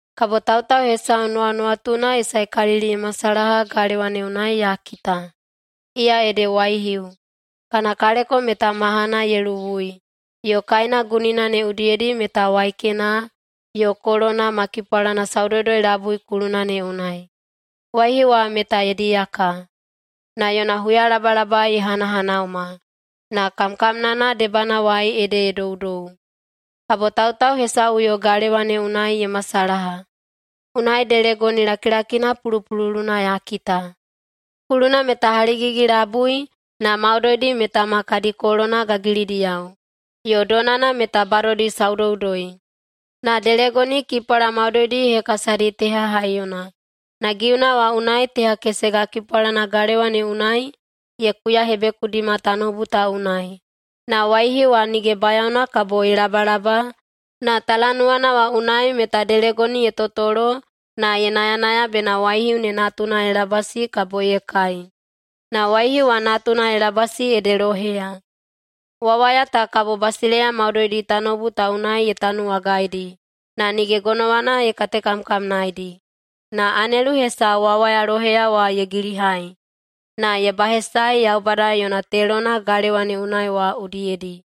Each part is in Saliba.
Kabo tautau hesau nuwanuwatuna ye saekalili ye masalaha galewa ne unai ya kita. Iya ede waihiu, kana kaleko meta mahana ye luwui, yo kaena gunina ne udiyedi meta waikena, yo kolona ma kipwalana saudoudoi-labui kuluna ne unai. Waihiu wa meta ye diyaka. Na yona huyalabalaba ye hanahanauma, na kamkamnana debanawai ede ye doudou. Kabo tautau hesauꞌuyo galewa ne unai ye masalaha. Unai delegoni lakilakina pulupululuna ya kita. Kuluna meta haligigi-labui na maudoidi meta ma kadi kolona gagilidiyao, yo donana meta badodi saudoudoi. Na delegoni kipwala maudoidi ye hekasadi teha haiyona, na giuna wa unai teha kesega kipwalana galewa ne unai ye kuyahebekudima tanoubu ta unai. Na waihiu wa nige bayaona kabo ye labalaba na talanuwana wa unai meta delegoni ye totolo na ye nayanaya bena waihiu ne natuna ye labasi kabo ye kai. Na waihiu wa natuna ye labasi ede loheya. Wawaya ta kabo basileiya maudoidi tanoubu ta unai ye tanuwagaidi, na nige gonowana ye katekamkamnaedi. Na anelu hesau wawaya loheya wa ye gilihai, na ye bahesaei Yaubada yo yona telona galewa ne unai wa udiyedi.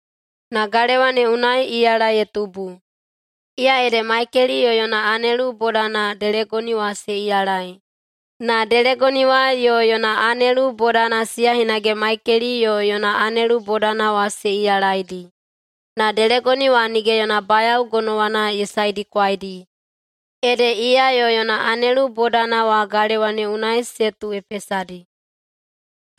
Na galewa ne unai iyala ye tubu. Iya ede Maikeli yo yona anelu bodana delegoni wa se iyalai, na delegoni wa yo yona anelu bodana, siya hinage Maikeli yo yona anelu bodana wa se iyalaidi. Na delegoni wa nige yona bayao gonowana ye saedikwaidi, ede iya yo yona anelu bodana wa galewa ne unai se tuuhepesadi.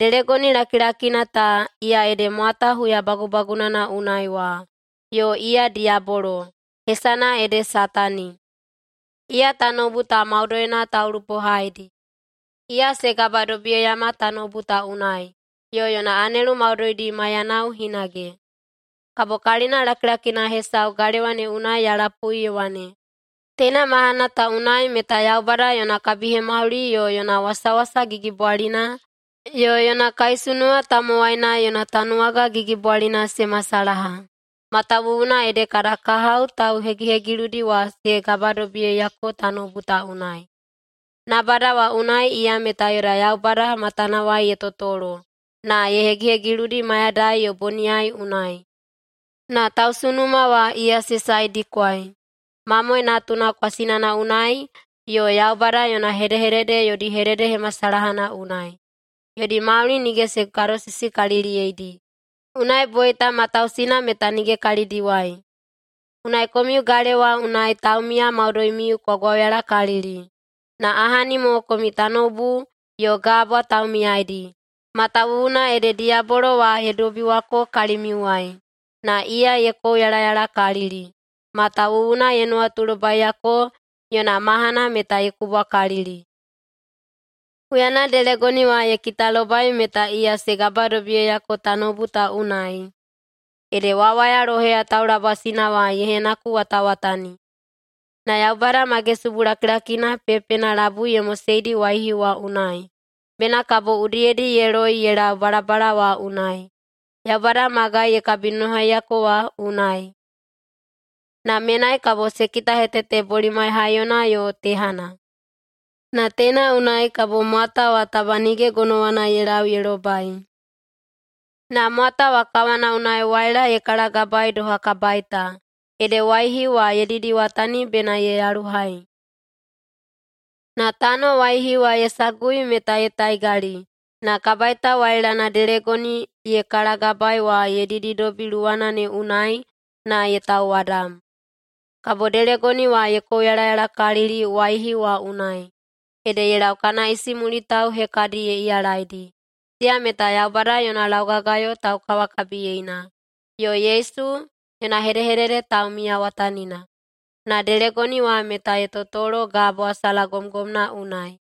Delegoni lakilakina ta, iya ede mwata huya bagubagunana unai wa yo iya diyabolo. Hesana ede Satani. Iya tanoubu ta maudoina taulupohaidi. Iya se gabadobiyeiyama tanoubu ta unai, yo yona anelu maudoidi maiyanao hinage. Kabo kalina lakilakina hesau galewa ne unai ya lapui ye wane, “Teina mahana ta unai meta Yaubada yona kabihemauli yo yona wasawasa gigibwalina yo yona kaisunuwa tamowaina yona tanuwaga gigibwalina se masalaha. Matawuwuna ede kada kahao tauhegihegiludi wa ye gabadobiyeiyako tanoubu ta unai. Nabada wa unai iya meta yoda Yaubada matanawai ye totolo na ye hegihegiludi mayadai yo boniyai unai. Na tausunuma wa iya se saedikwai Mamoe Natuna kwasinana unai yo Yaubada yona hedehedede yodi hededehemasalahana unai. Yodi mauli nige se gadosisikaliliyeidi, unai boita matausina meta nige kalidiwai. Unai komiu galewa unai taumiya maudoimiu kwa gwauyalakalili. Na ahani mo komiu tanoubu yo gabwa taumiyaidi, matawuwuna ede diyabolo wa ye dobiwako kalimiuwai! Na iya ye kouyalayalakalili, matawuwuna ye nuwatulobaiyako yona mahana meta ye kubwakalili.” Huyana delegoni wa ye kitalobai meta iya se gabadobiyeiyako tanoubu ta unai, ede wawaya loheya taulabasina wa ye henakuwatawatani. Na Yaubada magesubu lakilakina pepena labui ye moseidi waihiu wa unai, bena kabo udiyedi ye loi ye lau balabala wa unai, Yaubada magai ye kabinonohaiyako wa unai. Na menai kabo se kitahetete bolimai haiyona yo tehana. Na teina unai kabo mwata wa taba nige gonowana ye lau ye lobai. Na mwata wa kawana unai waila ye kalagabaei doha kabaita, ede waihiu wa ye didiwatani bena ye yaluhai. Na tano waihiu wa ye sagui meta ye taigali na kabaita wailana delegoni ye kalagabaei wa ye dididobi luwana ne unai na ye tauwadam. Kabo delegoni wa ye kouyalayalakalili waihiu wa unai. Ede ye lau kana isimulitao hekadi ye iyalaidi. Siya meta Yaubada yona laugagayo taukawakabiyeina, yo Yesu yona hedehedede taumiyawatanina. Na delegoni wa meta ye totolo gabwa salagomgomna unai.